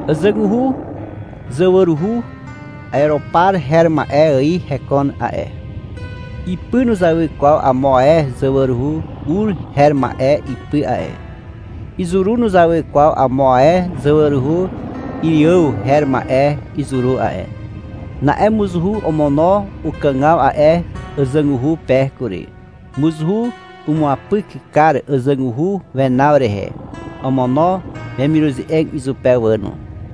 Àzàguhu zawaruhu ereopar her ma'e ài hekon a'e. Ipy nuzawy kwaw amo ae zawaruhu ur her ma'e ipy a'e. Izuru nuzawy kwaw amo ae zawaruhu iriàw her ma'e izuru a'e. Na'e mozuhu omono ukàgaw a'e àzàguhu pe kury. Mozuhu umuapyk kar àzàguhu wenaw rehe. Omono wemiruze'eg izupe wà no.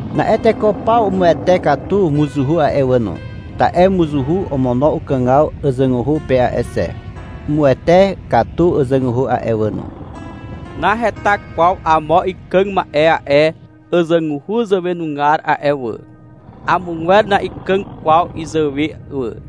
Na'e teko paw umuwete katu mozuhu a'e wà no, ta'e mozuhu omono ukàgaw àzàguhu pe a'e xe. Umuwete katu àzàguhu a'e wà no. — Naheta kwaw amo ikàg ma'e a'e àzàguhu zàwenugar a'e wà. Amogwer na'ikàg kwaw izàwe wà, i'i izupe wà.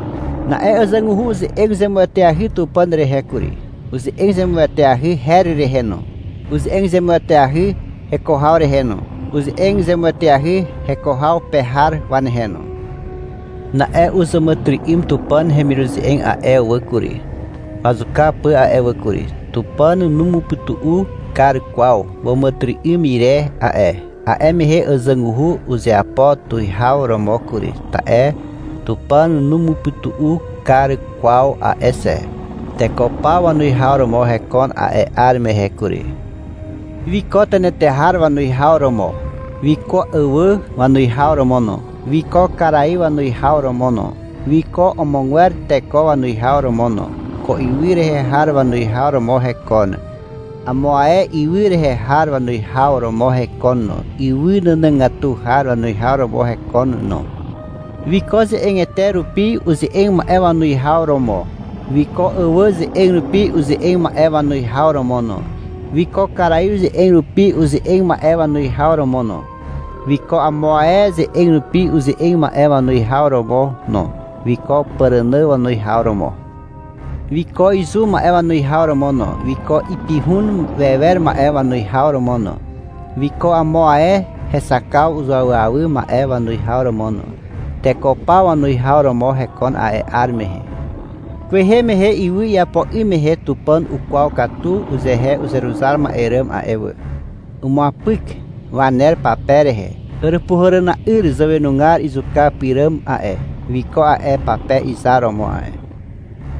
Na'e àzàguhu uze'eg zemueteahy Tupàn rehe kury, uze'eg zemueteahy her rehe no, uze'eg zemueteahy heko haw rehe no, uze'eg zemueteahy heko haw pe har wanehe no. Na'e uzàmàtyry'ym Tupàn hemiruze'eg a'e wà kury, wazuka pà a'e wà kury. Tupàn numupytu'u kar kwaw wàmàtyry'ym ire a'e. A'e mehe àzàguhu uzeapo tuwihaw romo kury, ta'e Tupàn numupytu'u kar kwaw a'e xe. Teko paw wanuwihaw romo hekon a'e 'ar mehe kury. Wiko tenetehar wanuwihaw romo. Wiko àwà wanuwihaw romo no. Wiko karaiw wanuwihaw romo no. Wiko amogwer teko wanuwihaw romo no. Ko ywy rehe har wanuwihaw romo hekon, amo ae ywy rehe har wanuwihaw romo hekon no, ywy nànàgatu har wanuwihaw romo hekon no. Wiko ze'egete rupi uze'eg ma'e wanuwihaw romo. Wiko àwà ze'eg rupi uze'eg ma'e wanuwihaw romo no. Wiko karaiw ze'eg rupi uze'eg ma'e wanuwihaw romo no. Wiko amo ae ze'eg rupi uze'eg ma'e wanuwihaw romo no. Wiko pàrànà wanuwihaw romo. Wiko izu ma'e wanuwihaw romo no. Wiko ipihun wewer ma'e wanuwihaw romo no. Wiko amo ae hexakaw zuawyawy ma'e wanuwihaw romo no. Teko paw wanuwihaw romo hekon a'e 'ar mehe. Kwehe mehe ywy iapo 'ym mehe Tupàn ukwaw katu uzehe uzeruzar ma'e ràm a'e wà. Umuapyk waner pape rehe. Àràpuhàràna'yr zàwenugar izuka pyràm a'e, wiko a'e pape izar romo a'e.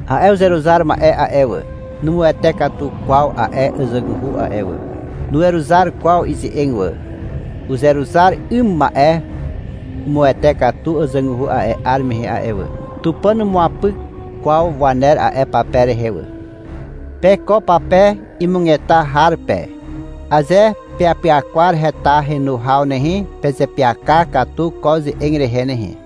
A'e uzeruzar ma'e a'e wà, numuwete katu kwaw a'e àzàguhu a'e wà. Nuweruzar kwaw ize'eg wà. Uzeruzar 'ym ma'e umuwete katu àzàguhu a'e 'ar mehe a'e wà. Tupàn numuapyk kwaw waner a'e pape rehe wà. Pe ko pape imugeta har pe, aze peapyakwar heta henu haw nehe, pezeapyaka katu ko ze'eg rehe nehe.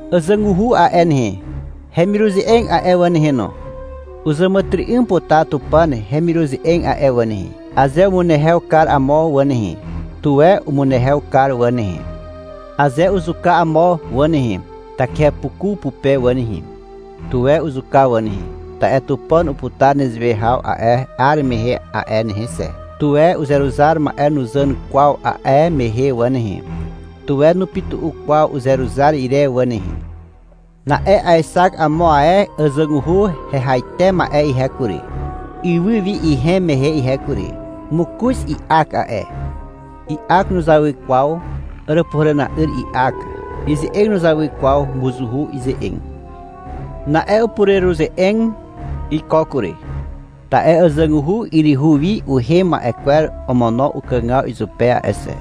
Àzàguhu a'e nehe, hemiruze'eg a'e wà nehe no, uzàmàtyry'ym putar Tupàn hemiruze'eg a'e wà nehe. Aze umunehew kar amo wà nehe, tuwe umunehew kar wà nehe. Aze uzuka amo wà nehe, takihepuku pupe wà nehe, tuwe uzuka wà nehe, ta'e Tupàn uputar nezewe haw a'e 'ar mehe a'e nehe xe. Tuwe uzeruzar ma'e nuzàn kwaw a'e mehe wà nehe, tuwe nupytu'u kwaw uzeruzar ire wà nehe. Na'e aexak amo ae àzàguhu hehaite ma'e ihe kury, ywy wi ihem mehe ihe kury. Mokoz i'ak a'e. I'ak nuzawy kwaw Àràpuhàràna'yr i'ak. Ize'eg nuzawy kwaw mozuhu ize'eg. Na'e upureruze'eg iko kury, ta'e àzàguhu yryhu wi uhem ma'e kwer omono ukàgaw izupe a'e xe.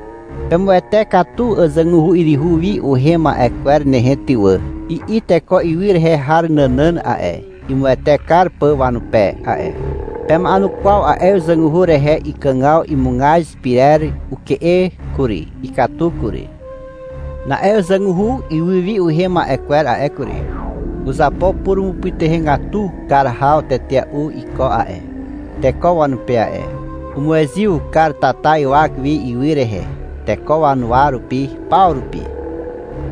— Pemuwete katu àzàguhu yryhu wi uhem ma'e kwer nehe ty wà, i'i teko ywy rehe har nànàn a'e, imuwete kar pà wanupe a'e. Pema'enukwaw a'e àzàguhu rehe. Iàkàg imugaz pyrer uke'e kury, ikatu kury. Na'e àzàguhu ywy wi uhem ma'e kwer a'e kury, uzapo purumupytuhegatu kar haw tetea'u iko a'e, teko wanupe a'e. Umuezyw kar tata ywak wi ywy rehe, teko wanuwa rupi paw rupi.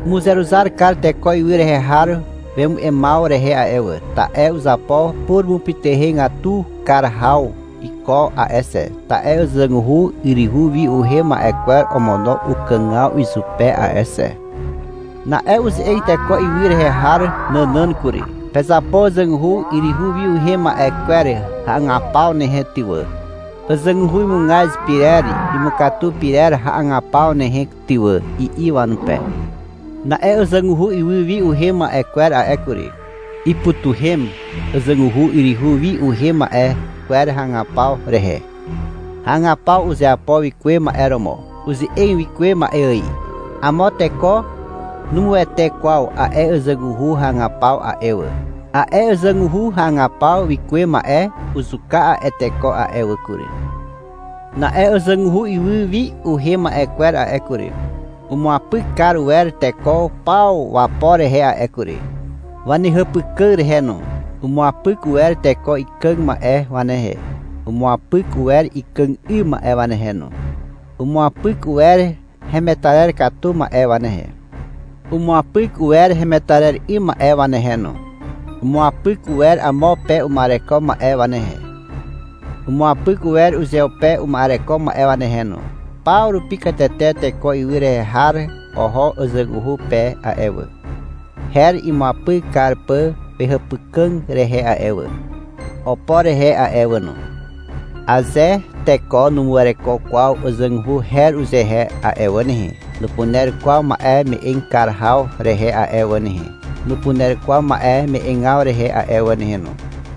Umuzeruzar kar teko ywy rehe har wemu'emaw rehe a'e wà, ta'e uzapo purumupytuhegatu kar haw iko a'e xe, ta'e àzàguhu yryhu wi uhem ma'e kwer omono ukàgaw izupe a'e xe. Na'e uze'eg teko ywy rehe har nànàn kury. — Pezapo àzàguhu yryhu wi uhem ma'e kwer hagapaw nehe ty wà, àzàguhu imugaz pyrer imukatu pyrer hagapaw nehe ty wà, i'i wanupe. Na'e àzàguhu ywy wi uhem ma'e kwer a'e kury, ipytuhem àzàguhu yryhu wi uhem ma'e kwer hagapaw rehe. Hagapaw uzeapo wikuwe ma'e romo. Uze'eg wikuwe ma'e ài. Amo teko numuwete kwaw a'e àzàguhu hagapaw a'e wà. A'e àzàguhu hagapaw wikuwe ma'e uzuka a'e teko a'e wà kury. Na'e àzàguhu ywy wi uhem ma'e kwer a'e kury, umuapyk kar uwer teko paw wapo rehe a'e kury, wanehàpykà rehe no. Umuapyk uwer teko ikàg ma'e wanehe. Umuapyk uwer ikàg 'ym ma'e wanehe no. Umuapyk uwer hemetarer katu ma'e wanehe. Umuapyk uwer hemetarer 'ym ma'e wanehe no. Umuapyk uwer amo pe uma'ereko ma'e wanehe. Umuapyk uwer uzeupe uma'ereko ma'e wanehe no. Paw rupi katete teko ywy rehe har oho àzàguhu pe a'e wà, her imuapyk kar pà wehàpykà rehe a'e wà, opo rehe a'e wà no. Aze teko nuwereko kwaw àzàguhu her uzehe a'e wà nehe, nupuner kwaw ma'e me'eg kar haw rehe a'e wà nehe, nupuner kwaw ma'e me'egaw rehe a'e wà nehe no.